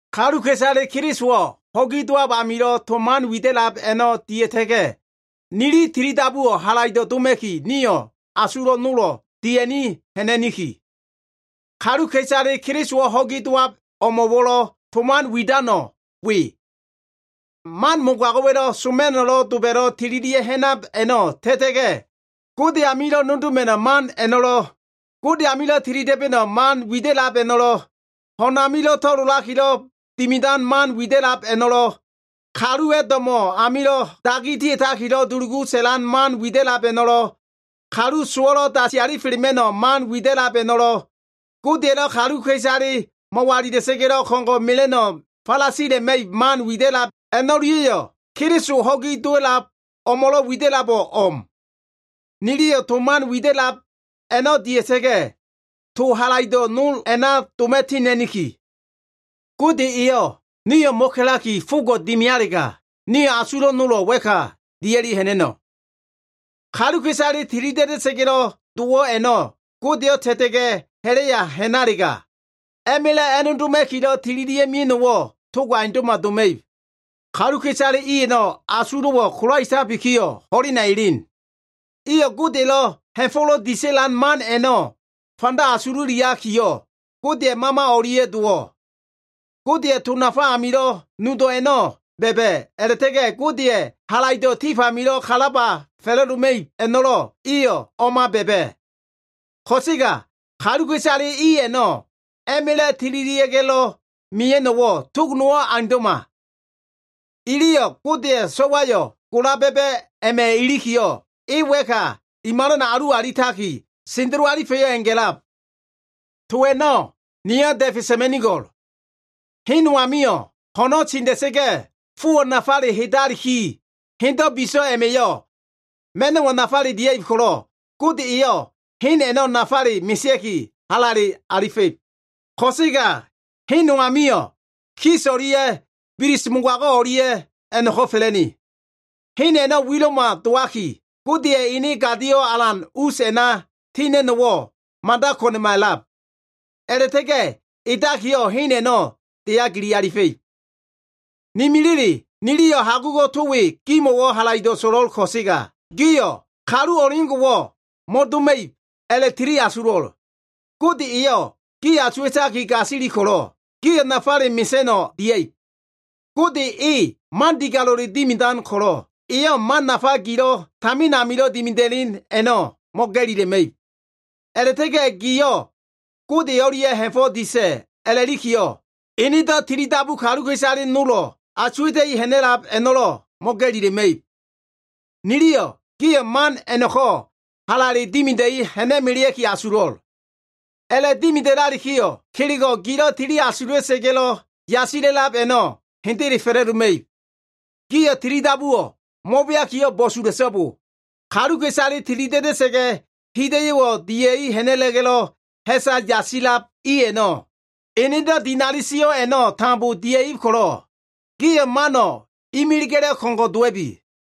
Kaluka꞉isale Kelisowo꞉ ho꞉gi dowab amilo꞉ to man wida꞉lab a꞉no꞉ dia꞉ta꞉ga꞉, nili tilidabuwo꞉ halaido꞉ doma꞉ki nio꞉ asulo꞉ nolo꞉ dia꞉ni ha꞉na꞉niki. Kaluka꞉isale Kelisowo꞉ ho꞉gi dowab o꞉mo꞉lo꞉ to man widano꞉ we. Man mogago꞉wa꞉lo꞉ soma꞉no꞉ doba꞉da꞉lo꞉ tililia꞉ ha꞉nan a꞉no꞉ ta꞉ta꞉ga꞉, Gode amilo꞉ nodoma꞉no꞉ man a꞉no꞉lo꞉, Gode amilo꞉ tilida꞉ba꞉no꞉ man widab a꞉no꞉lo꞉, ho꞉na to꞉lolakilo꞉ dimidan man widab a꞉no꞉lo꞉, kaluwa꞉ do꞉mo꞉ amilo꞉ dagi dia꞉takilo꞉ dulugu sa꞉lan man widab a꞉no꞉lo꞉, kalu sowo꞉lo꞉ dasi alifelema꞉no꞉ man widab a꞉no꞉lo꞉, Godeya꞉lo꞉ kaluka꞉isale mo꞉walila꞉sa꞉ga꞉lo꞉ ko꞉ngo꞉ mela꞉no꞉ falasila꞉ma꞉ib man widab a꞉no꞉lia꞉yo꞉, Keliso ho꞉gi dowab o꞉mo꞉lo꞉ wida꞉labo꞉ o꞉m. Niliyo꞉ to man widab a꞉no꞉ dia꞉sa꞉ga꞉, to halaido꞉ nol a꞉na doma꞉ tina꞉niki. Gode eyo꞉ nio꞉ mo꞉ka꞉laki fogo꞉ dimialega, nio꞉ asulo꞉ nolo꞉ wa꞉ka dia꞉liki ha꞉na꞉no꞉. Kaluka꞉isale tilida꞉da꞉sa꞉ga꞉lo꞉ dowo꞉ a꞉no꞉ Godeyo꞉ ta꞉ta꞉sa꞉ga꞉ ha꞉la꞉ya ha꞉nalega, a꞉ma꞉la꞉ a꞉nodoma꞉kilo꞉ tililia꞉ mia꞉no꞉wo꞉ togo꞉ aundo꞉ma doma꞉ib. Kaluka꞉isale i a꞉no꞉ asulo꞉wo꞉ kolaetabikiyo꞉ ho꞉lena elen. Iyo꞉ Godeya꞉lo꞉ ha꞉fo꞉lo꞉ disa꞉lan man a꞉no꞉ fanda asululiakiyo꞉, Godeya꞉ Mama o꞉lia꞉ dowo꞉. Godeya꞉ to nafa amilo꞉ nudo꞉ a꞉no꞉ ba꞉ba꞉, a꞉la꞉ta꞉ga꞉ Godeya꞉ halaido꞉ tif amilo꞉ kalaba fa꞉la꞉doma꞉ib a꞉no꞉lo꞉ iyo꞉ o꞉ma ba꞉ba꞉. Ko꞉sega kaluka꞉isale i a꞉no꞉ a꞉ma꞉la꞉ tililia꞉ga꞉lo꞉ mia꞉no꞉wo꞉ tog nowo꞉ aundo꞉ma. Iliyo꞉ Godeya꞉ So꞉wayo꞉ gola ba꞉ba꞉ a꞉ma꞉ ilikiyo꞉, e wa꞉ka i malana alu alitaki, sendelo alifa꞉yo꞉ a꞉nga꞉lab. To a꞉no꞉ niyo꞉ da꞉fe sa꞉ma꞉nigo꞉l. Hen no amio꞉ ho꞉no꞉ tinda꞉sa꞉ga꞉ fowo꞉ nafale heda꞉laliki, hendo꞉ biso꞉ a꞉ma꞉yo꞉ ma꞉no꞉wo꞉ nafale dia꞉ib ko꞉lo꞉, Gode eyo꞉ hen a꞉no꞉ nafale mesea꞉ki, halale alifa꞉ib. Ko꞉sega hen no amio꞉, kis o꞉lia꞉ bilis mogago꞉ o꞉lia꞉ a꞉no꞉ko꞉ fa꞉la꞉ne. Hen a꞉no꞉ wilo꞉ma dowaki, Godeya꞉ ene gadio꞉ alan us a꞉na tina꞉no꞉wo꞉ mada ko꞉na꞉ma a꞉lab. A꞉la꞉ta꞉ga꞉ edakiyo꞉, hen a꞉no꞉ deya gili alifa꞉ib. Ne milile, niliyo꞉ hagugo꞉ to we gimo꞉wo꞉ halaido꞉ so꞉lo꞉l ko꞉sega, gio꞉ kalu o꞉leo꞉ngo꞉wo꞉ mo꞉doma꞉ib a꞉la꞉tiliasulo꞉l. Gode eyo꞉ gi asuwa꞉taki gasili ko꞉lo꞉, gio꞉ nafale mesa꞉no꞉ dia꞉ib. Gode e man digalo꞉le dimidan ko꞉lo꞉, eyo꞉ man nafa gilo꞉ tamin amilo꞉ dimida꞉len a꞉no꞉ mo꞉ga꞉lila꞉ma꞉ib. A꞉la꞉ta꞉ga꞉ gio꞉ Gode o꞉lia꞉yo꞉ ha꞉fo꞉ disa꞉ a꞉lalikiyo꞉, enedo꞉ tilidabu kaluka꞉isale nolo꞉ asuwa꞉ta꞉i ha꞉na꞉lab a꞉no꞉lo꞉ mo꞉ga꞉lila꞉ma꞉ib. Niliyo꞉ gio꞉ man a꞉no꞉ ko꞉lo꞉ halale dimida꞉i ha꞉na꞉melea꞉ki asulo꞉l. A꞉la꞉dimida꞉lalikiyo꞉, kelego꞉ gilo꞉ tili asula꞉sa꞉ga꞉lo꞉ yasisab a꞉no꞉ hendele fa꞉la꞉doma꞉ib. Gio꞉ tilidabuwo꞉ mo꞉beakiyo꞉ bo꞉sula꞉so꞉bo! Kaluka꞉isale tilida꞉da꞉sa꞉ga꞉ hida꞉yo꞉wo꞉ dia꞉ ha꞉na꞉la꞉ga꞉lo꞉ ha꞉sa yasila꞉lab i a꞉no꞉, enedo꞉ dinali sio꞉ a꞉no꞉ tambo dia꞉ib ko꞉lo꞉, gio꞉ mano꞉ imiliga꞉lo꞉ ko꞉ngo꞉ dowa꞉bi.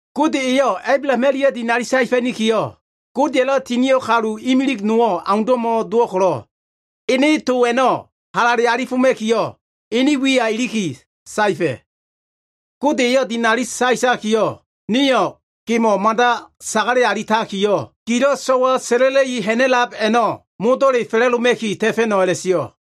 Gode eyo꞉ Ablaham o꞉lia꞉ dinali saefa꞉nikiyo꞉, Godelo꞉ tinio꞉ kalu imilig nowo꞉ aundo꞉ma dowo꞉ ko꞉lo꞉, ene to a꞉no꞉ halale alifoma꞉kiyo꞉, ene wiya iliki saefa꞉. Gode eyo꞉ dinali saetakiyo꞉, “Niyo꞉ gemo꞉ mada sagale alitakiyo꞉, gilo꞉ so꞉wa sa꞉la꞉la꞉i ha꞉na꞉lab a꞉no꞉ modo꞉le fa꞉la꞉doma꞉ki ta꞉fa꞉no꞉” a꞉la꞉sio꞉.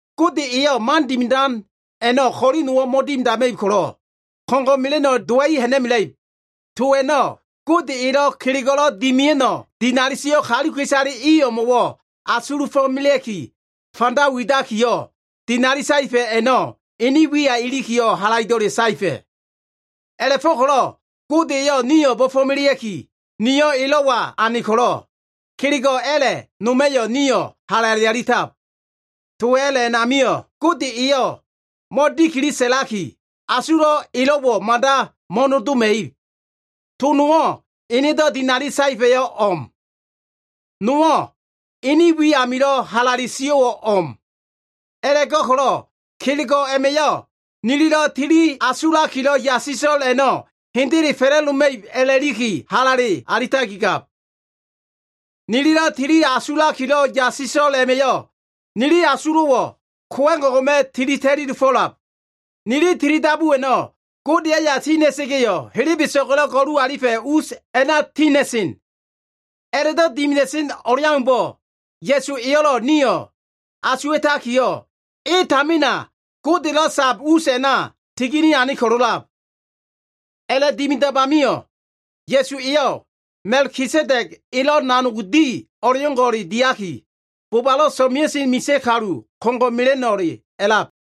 Gode elo꞉ man dimidan a꞉no꞉ ko꞉li nowo꞉ mo꞉dimidama꞉ib ko꞉lo꞉, ko꞉ngo꞉ mela꞉no꞉ dowa꞉i ha꞉na꞉mela꞉ib. To a꞉no꞉ Gode elo꞉ kelego꞉lo꞉ dimia꞉no꞉ dinali sio꞉ kaluka꞉isale i o꞉mo꞉wo꞉ asuluma꞉ki fanda widakiyo꞉, dinali saefa꞉ a꞉no꞉ ene wiya ilikiyo꞉ halaido꞉le saefa꞉. A꞉la꞉fo꞉ko꞉lo꞉ Gode eyo꞉ nio꞉ bo꞉fo꞉melea꞉ki, nio꞉ elo꞉wa ane ko꞉lo꞉, kelego꞉ a꞉la꞉ noma꞉yo꞉ nio꞉ halale alitab. To a꞉la꞉ a꞉namio꞉ Gode eyo꞉ mo꞉dikili sa꞉laki, asulo꞉ elo꞉wo꞉ mada mo꞉nodoma꞉ib. To nowo꞉ enedo꞉ dinali saefa꞉yo꞉ o꞉m. Nowo꞉ ene wi amilo꞉ halale sio꞉wo꞉ o꞉m. A꞉la꞉go꞉ko꞉lo꞉ kelego꞉ a꞉ma꞉yo꞉ nililo꞉ tili asulakilo꞉ yasila꞉lo꞉l a꞉no꞉ hendele fa꞉la꞉doma꞉ib a꞉la꞉liki halale alitakigab. Nililo꞉ tili asulakilo꞉ yasiso꞉l a꞉ma꞉yo꞉ nili asulo꞉wo꞉ kowa꞉g o꞉ngo꞉ma꞉ tili ta꞉li dofo꞉lab. Nili tilidabu a꞉no꞉ Godeya꞉ aya tina꞉sa꞉ga꞉yo꞉, helebeso꞉ga꞉lo꞉ galalifa꞉ us a꞉na tina꞉sen. A꞉la꞉do꞉ dimida꞉sen o꞉leaumbo꞉, Ya꞉su eyo꞉lo꞉ nio꞉ asuwa꞉takiyo꞉, e tamina Godelo꞉ sab us a꞉na tigini ane ko꞉lo꞉lab. A꞉la꞉dimidab amio꞉ Ya꞉su eyo꞉ Ma꞉kisedeg elo꞉ nanog di o꞉leo꞉ngo꞉ diaki, bobalo꞉ so꞉mea꞉sen misa꞉ kalu ko꞉ngo꞉ mela꞉no꞉le a꞉lab.